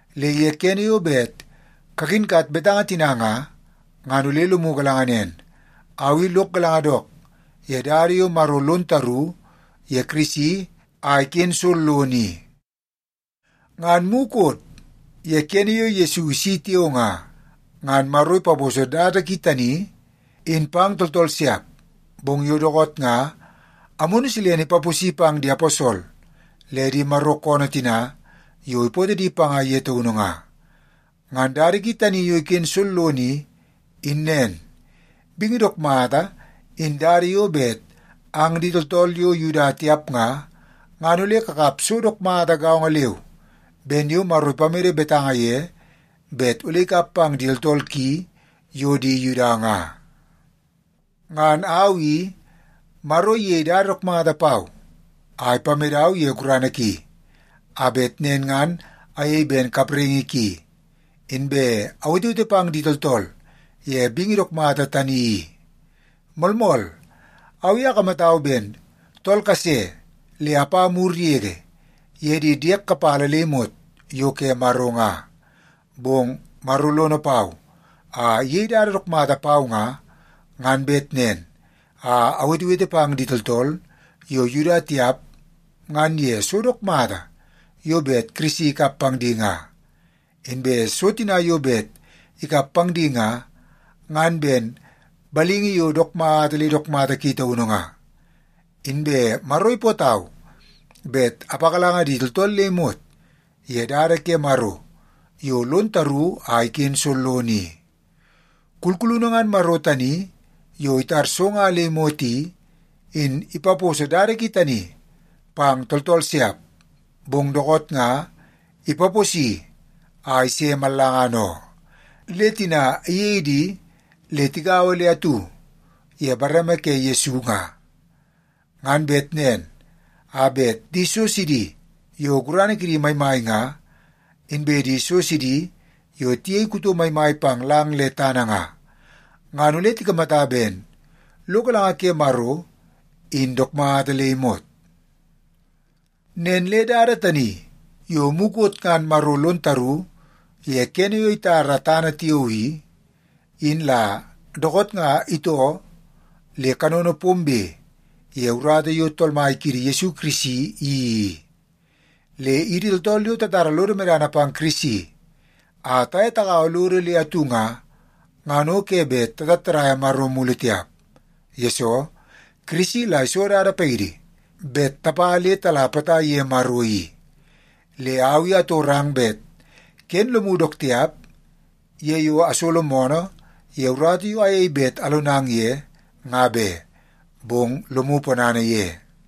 Le ye kene yo bet kakinkat betanga tina nga, ngan ole lomu galanga nen, au i lok galanga dook ye dada yo Maro lon taru ye Kirisi a iken sollono i. Ngan mukot ye kene yo Yesu isi tiao nga, ngan Maro ipaposo dada ki tani in pang tooltool siap. Bong yo dookoot nga Amunu Silene ipaposi pang di aposol le di Maro koonoo tina yo ipootoo di panga ye taunu nga. Ngan dada ki tani yo iken sollono i, in nen: Bingi dook mata in dada yo bet ang di tooltool yo Yuda tiap nga, ngan ole kakap so dook mata gaongo leu ben yo Maro ipamede betanga ye bet ole ikap pang di tooltool ki yo di Yuda nga. Ngan au i, Maro iyei dada dook mata pau a ipamedau ye gurana ki, a bet nen ngan ayei ben kapraingi ki, inbe awetewete pang di tooltool ye bingi dook mata tani i. Moolmool, au i akamatau ben tool kase le apa mur yege ye di diek kapala le imot yo ke Maro nga. Bong Maro lono pau a iyei dada dook mata pau nga, ngan bet nen a awetewete pang di tooltool yo Yuda tiap ngan ye so dook mata yo bet Kirisi ikap pang di nga. Inbe so tina yo bet ikap pang di nga, ngan ben balingi yo dook mata le dook mata ki taunu nga. Inbe Maro ipootau bet apagalanga di tooltool le imot ye dada ke Maro yo lon taru a iken sollono i. Kulkulunu ngan Maro tani yo itar so nga le imot i, in ipaposo dada ki tani pang tooltool siap, bong dookoot nga ipaposi a ise mallangana oo. Le tina iyei di le tigaua le atu ye bareme ke Yesu nga, ngan bet nen a bet di so sidi yo gurana kidi maimai nga, inbe di so sidi yo tiyei kuto maimai pang lang le tana nga, ngan ole tikamata ben lo galanga ke Maro in dook mata le imot. Nen le dada tani yo mukot ngan Maro lon taru ye kene yo itara tana tiao i, in la dookoot nga itoo le kanono pombe ye urata yo Tool Mai kiidi Yesu Kirisi iyeii i. Le idi tooltool yo tatara lodo medana pang Kirisi a taye tagaua lodo le atu nga, ngan o ke bet tatattadaia Maro mulu tiap. Yesoo, Kirisi la iso dada paidi bet tapa le tala potai ye Maro i. Le au i atorang bet ken lomu dook tiap ye yo asolo moonoo ye urata yo ayei bet alonang ye, nga be, bong lomu ponana ye.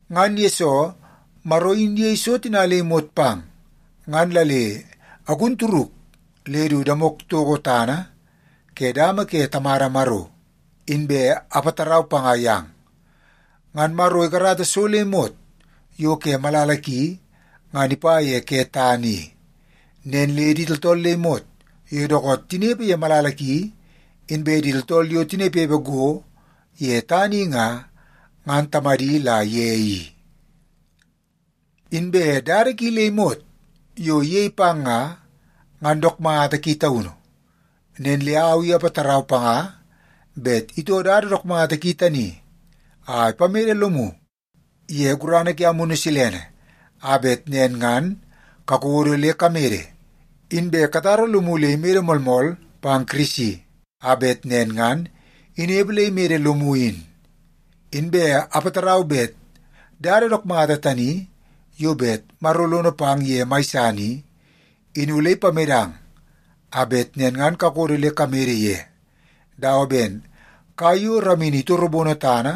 Ngan yesoo Maro in iyei so tina le imot pang, ngan la le agun turuk le du damok toko tana ke dama ke Tamada Maro, inbe apatarau panga yang. Ngan Maro ikarata so le imot yo ke malala ki ngan ipa ye ke tana i. Nen le di tooltool le imot yo dookoot nga tinepe ye malala ki inbe di tooltool yo tinepepe go ye tana i nga, ngan Tamadi la ye i. Inbe dada ki le imot yo iyei pang nga, ngan dook mata ki taunu. Nen le au i apatarau panga bet itoo dada dook mata ki tani a ipamede lomu ye gurana ke Amunu Silene a bet nen ngan kakodo le kamede, inbe katara lomu le imede moolmool pang Kirisi, a bet nen ngan inepe le imede lomu in. Inbe apatarau bet dada dook mata tani yo bet Maro lono pang ye mai san i, in ole ipamedang a bet nen ngan kakodo le kamede ye dawa ben kai yo ramini itorobono tana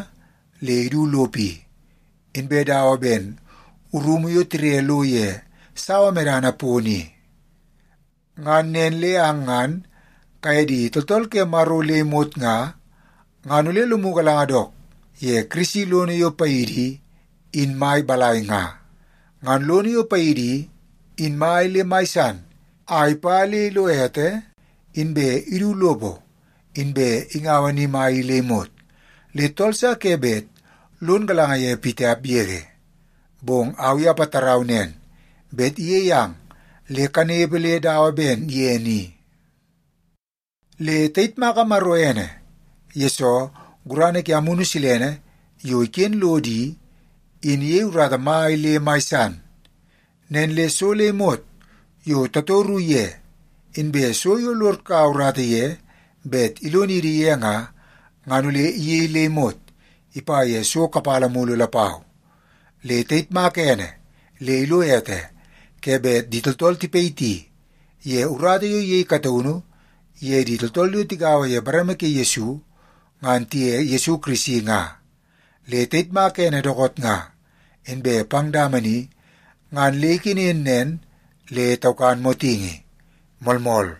le idu lopo i, inbe dawa ben rumu yo tire lo ye sawa medana pono i. Ngan nen le ang ngan kaye di tooltool ke Maro le imot nga, ngan ole lomu galanga dook ye Kirisi lono yo paidi i, in mai balai nga. Ngan lono yo paidi i, in mai le mai san a ipa le ilo ete inbe idu lopo inbe ingaua ni mai i le imot, le tool sa ke bet lon galanga ye pitiap yege. Bong au i apatarau nen, bet iyei ang le kanepe le dawa ben ye ni. Le tayitmaka Maro ene, yesoo gurana ke Amunu Silene yo iken lodo i, in iyei urata mai le mai san. Nen le so le imot yo tatoru ye, inbe so yo lod kaua urata ye bet ilonidi ye nga, ngan ole iyei le imot ipa ye so kapala mulu lapau. Le tayitmaka ene le ilo ete ke bet di tooltool tipayiti ye urata yo iyei kataunu ye di tooltool yo tigaua ye bareme ke Yesu ngan tiye Yesu Kirisi nga. Le tayitmaka ene dookoot nga inbe pang dama ni ngan le ikenen nen le taukan motingi. Moolmool.